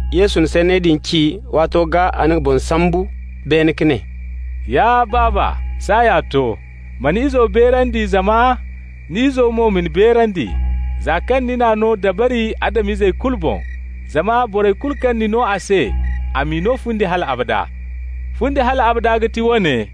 Yesu na sanney din ci, waato gaa a na nga boŋ sambu beene ka ne: «Ya Baaba, saaya to. Ma ni Izo beerandi zama ni Izo mo ma ni beerandi, za kaŋ ni n'a no dabari Adam-izey kulu boŋ, zama borey kulu kaŋ ni no a se, a m'i no fundi hal abada. Fundi hal abada ga ti woone: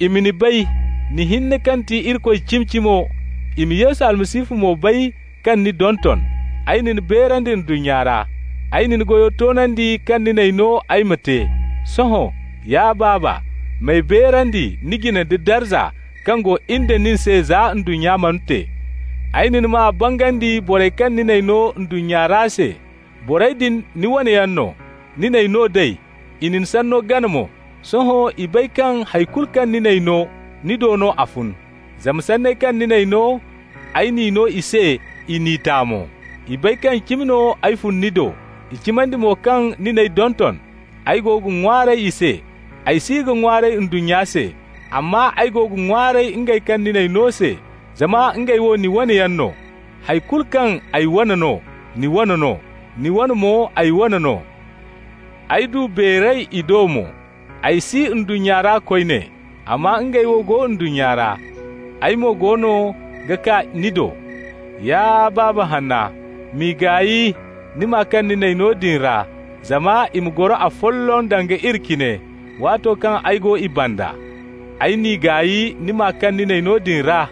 i ma ni bay, ni hinne kaŋ ti Irikoy cimi-cimo, i ma Yesu Almasihu mo bay kaŋ ni donton. Ay na ni beerandi ndunnya ra. Ay na goyo toonandi kaŋ ni n'ay no ay ma te. Sohõ, ya Baaba, m'ay beerandi ni jine da darza kaŋ go in da nin se za ndunnya mana te. Ay na ni maa bangandi borey kaŋ ni n'ay no ndunnya ra se. Borey din, ni wane yaŋ no. Ni n'ay no nd'ey, i na ni sanno gana mo. Sohõ i bay kaŋ hay kulu kaŋ ni n'ay no, ni do no a fun. Zama sanney kaŋ ni n'ay no, ay n'i no i se, i n'i ta mo. I bay kaŋ cimi no ay fun ni do, i cimandi mo kaŋ ni n'ay donton. Ay go ga ŋwaaray i se. Ay si ga ŋwaaray ndunnya se, amma ay go ga ŋwaaray ngey kaŋ ni n'ay no se, zama ngey wo ni wane yaŋ no. Hay kulu kaŋ ay wane no, ni wane no, ni wane mo ay wane no. Ay du beeray i do mo. Ay si ndunnya ra koyne, amma ngey wo go ndunnya ra, ay mo goono ga kaa ni do. Ya Baaba hanna, m'i gaay ni maa kaŋ ni n'ay no din ra, zama i ma goro afolloŋ danga iri cine. Waato kaŋ ay go i banda, ay n'i gaay ni maa kaŋ ni n'ay no din ra,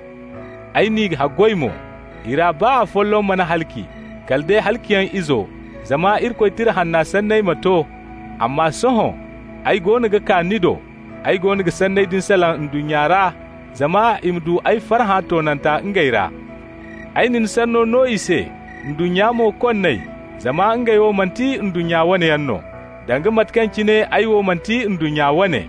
ay n'i haggoy mo. I ra baa boro folloŋ mana halaci, kala day halaciyaŋ izo, zama Irikoy Tira Hanna sanney ma to. Amma sohõ ay goono ga kaa ni do. Ay goono ga sanney din salaŋ ndunnya ra, zama i ma du ay farhã toonanta ngey ra. Ay na ni sanno no i se, ndunnya mo konn'ey, zama ngey wo manti ndunnya wane yaŋ no, danga mate kaŋ cine ay wo manti ndunnya wane.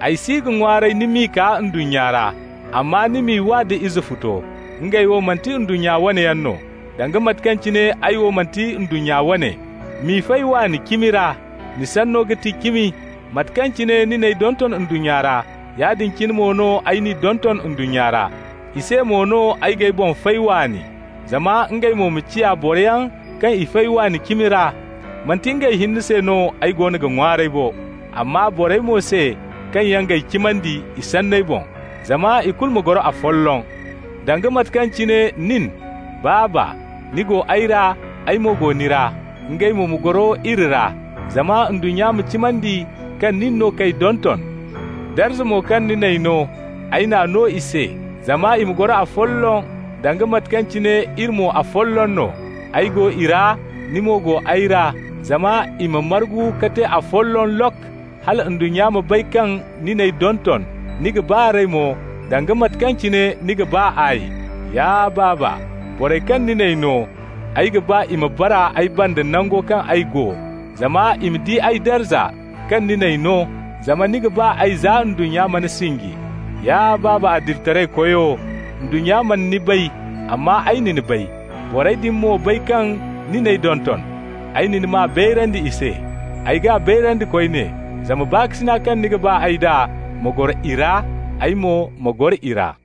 Ay si ga ŋwaaray ni m'i kaa ndunnya ra, amma ni m'i wa nda Izefuto. Ngey wo manti ndunnya wane yaŋ no, danga mate kaŋ cine ay wo manti ndunnya wane. M'i fay waani cimi ra. Ni Sanno ga ti cimi. Mate kaŋ cine ni n'ay donton ndunnya ra, yaadin cine mo no ay n'i donton ndunnya ra. I se mo no ay g'ay boŋ fay waani, zama ngey mo ma ciya boroyaŋ kaŋ i fay waani cimi ra. Manti ngey hinne se no ay goono ga ŋwaaray bo, amma borey mo se kaŋ yaŋ g'ay cimandi i sanney boŋ. Zama ikulu ma goro afolloŋ, danga mate kaŋ cine nin, Baaba, ni go ay ra, ay mo go ni ra. Ngey mo ma goro iri ra, zama ndunnya ma cimandi kaŋ nin no k'ay donton. Darza mo kaŋ ni n'ay no, ay n'a no i se, zama i ma goro afolloŋ danga mate kaŋ cine iri mo afolloŋ no. Ay go i ra, ni mo go ay ra, zama i ma margu ka te afolloŋ lok, hala ndunnya ma bay kaŋ ni n'ay donton, ni ga ba r'ey mo, danga mate kaŋ cine ni ga ba ay. Ya Baaba, borey kaŋ ni n'ay no, ay ga ba i ma bara ay banda nango kaŋ ay go, zama i ma di ay darza kaŋ ni n'ay no, zama ni ga ba ay za ndunnya mana sinji. Ya Baaba adilitaraykoyo, ndunnya mana ni bay, amma ay na ni bay. Borey din mo bay kaŋ ni n'ay donton. Ay na ni maa bayrandi i se. Ay g'a bayrandi koyne, zama baakasina kaŋ ni ga ba ay d'a ma goro i ra, ay mo ma goro i ra.»